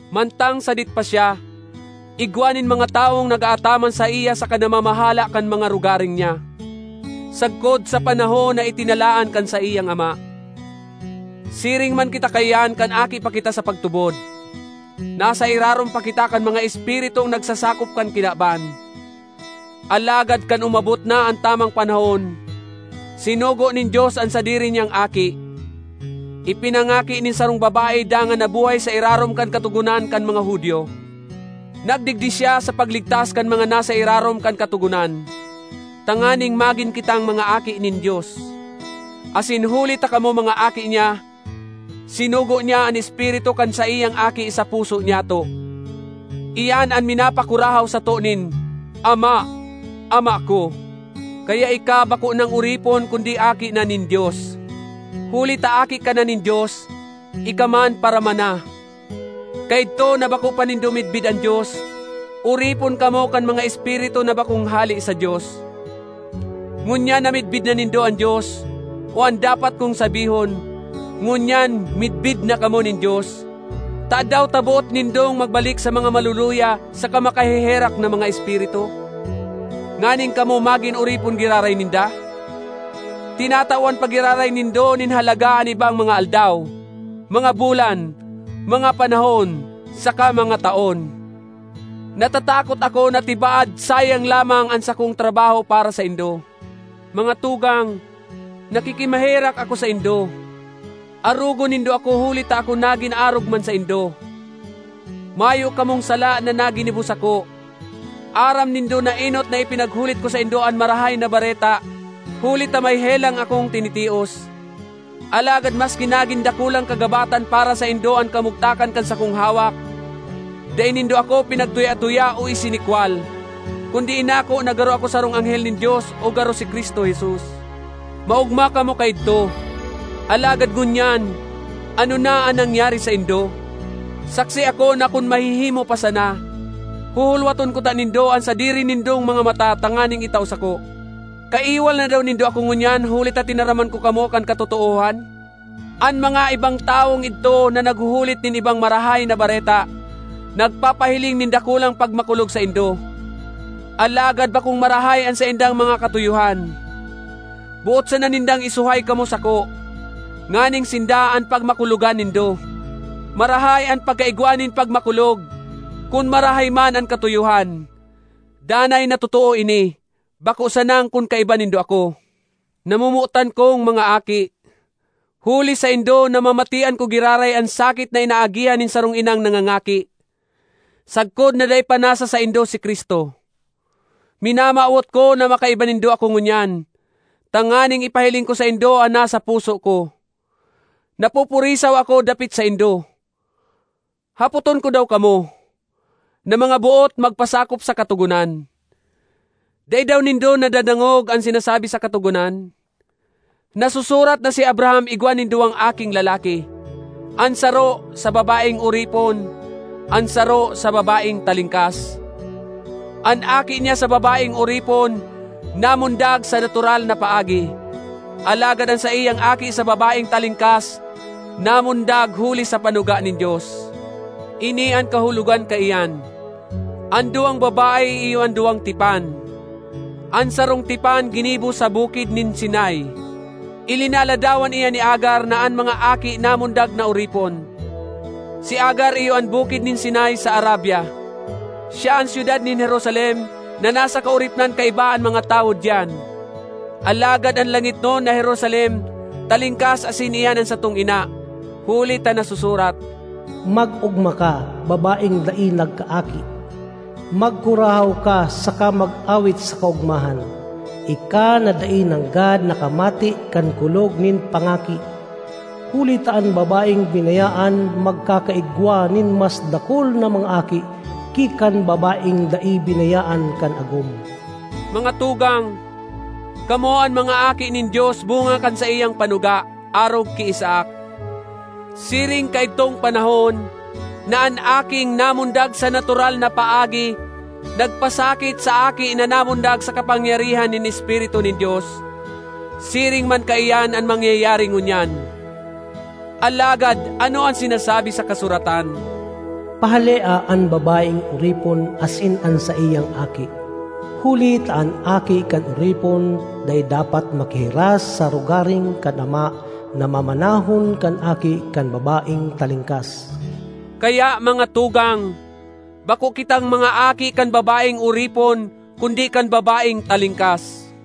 Mantang sadit pa siya, igwa nin mga tawong nag-aataman saiya saka namamahala kan mga rogaring niya, sagkod sa panahon na itinalaan kan saiyang ama. Siring man kita kaiyan kan aki pa kita sa pagtubod, nasa irarom pa kita kan mga espiritung nagsasakop kan kinaban. Alagad kan umabot na an tamang panahon, sinugo nin Dios an sadiri niyang Aki, ipinangaki nin sarong babae dangan nabuhay sa irarom kan Katogonan kan mga Judio. Nagdigdi siya sa pagligtas kan mga nasa irarom kan Katogonan, tanganing magin kitang mga aki nin Dios. Asin huli ta kamo mga aki niya, sinugo niya an Espiritu kan saiyang Aki sa puso nyato; iyan an minapakurahaw sato nin “Ama! Ama ko!” Kaya ika bako nang oripon kundi aki na nin Dios. Huli ta aki ka na nin Dios, ika man paramana. Kaidto na bako pa nindo midbid an Dios, oripon kamo kan mga espiritu na bakong hale sa Dios. Ngunyan na midbid na nindo an Dios—o an dapat kong sabihon, ngunyan midbid na kamo nin Dios—tadaw ta boot nindong magbalik sa mga maluluya saka makaheherak na mga espiritu? Nganing kamo magin oripon giraray ninda? Tinatawan pa giraray nindo nin halaga an ibang mga aldaw, mga bulan, mga panahon, saka mga taon. Natatakot ako na tibaad sayang lamang an sakong trabaho para saindo. Mga tugang, nakikimaherak ako saindo, arogon nindo ako huli ta ako nagin arog man saindo. Mayo kamong sala na naginibo sako. Aram nindo na enot na ipinaghulit ko saindo an Marahay na Bareta huli ta may helang akong tinitios. Alagad maski nagin dakulang kagabatan para saindo an kamugtakan kan sakong hawak, dai nindo ako pinagtuya-tuya o isinikwal, kundi inako na garo ako sarong anghel nin Dios o garo si Cristo Jesus. Maogma kamo kaidto! Alagad ngunyan ano na an nangyari saindo? Saksi ako na kun mahihimo pa sana, huhulwaton kuta nindo an sadiri nindong mga mata tanganing itao sako. Kaiwal na daw nindo ako ngunyan huli ta tinaraman ko kamo kan katotoohan? An mga ibang tawong idto na naghuhulit nin ibang “marahay na bareta” nagpapahiling nin dakulang pagmakulog saindo, alagad bakong marahay an saindang mga katuyohan. Boot sana nindang isuhay kamo sako, nganing sinda an pagmakulogan nindo. Marahay an pagkaigwa nin pagmakulog, kun marahay man an katuyohan; danay na totoo ini, bako sanang kun kaiba nindo ako. Namomotan kong mga aki, huli saindo namamatean ko giraray an sakit na inaagihan nin sarong inang nangangaki, sagkod na dai pa nasa saindo si Cristo. Minamawot ko na makaiba nindo ako ngunyan, tanganing ipahiling ko saindo an nasa puso ko. Napupurisaw ako dapit saindo! Hapoton ko daw kamo, na mga boot magpasakop sa Katogonan: dai daw nindo nadadangog an sinasabi sa Katogonan? Nasusurat na si Abraham igwa nin duwang aking lalaki; an saro, sa babaeng oripon, an saro, sa babaeng talingkas. An aki niya sa babaeng oripon namundag sa natural na paagi, alagad an saiyang aki sa babaeng talingkas namundag huli sa panuga nin Dios. Ini an kahulogan kaiyan: an duwang babae iyo an duwang tipan; an sarong tipan ginibo sa Bukid nin Sinai, ilinaladawan iyan ni Agar na an mga aki namundag na oripon. Si Agar iyo an Bukid nin Sinai sa Arabia; siya an syudad nin Jerusalem na nasa kaoripnan kaiba an mga tawo diyan. Alagad an langitnon na Jerusalem talingkas asin iyan an satong ina. Huli ta nasusurat: “Mag-ogma ka, babaeng dai nagkaaki! Magkurahaw ka saka mag-awit sa kaogmahan, ika na dai nanggad nakamate kan kulog nin pangaki! Huli ta an babaeng binayaan magkakaigwa nin mas dakul na mga aki ki kan babaeng dai binayaan kan agom.” Mga tugang, kamo an mga aki nin Dios bunga kan saiyang panuga, arog ki Isaac. Siring kaidtong panahon na an aking namundag sa natural na paagi nagpasakit sa aki na namundag sa kapangyarihan nin Espiritu nin Dios, siring man kaiyan an mangyayari ngunyan. Alagad ano an sinasabi sa kasuratan? “Pahalea an babaeng oripon asin an saiyang aki, huli ta an aki kan oripon dai dapat makihiras sa rogaring kan ama na mamanahon kan aki kan babaeng talingkas.” Kaya, mga tugang, bako kitang mga aki kan babaeng oripon kundi kan babaeng talingkas.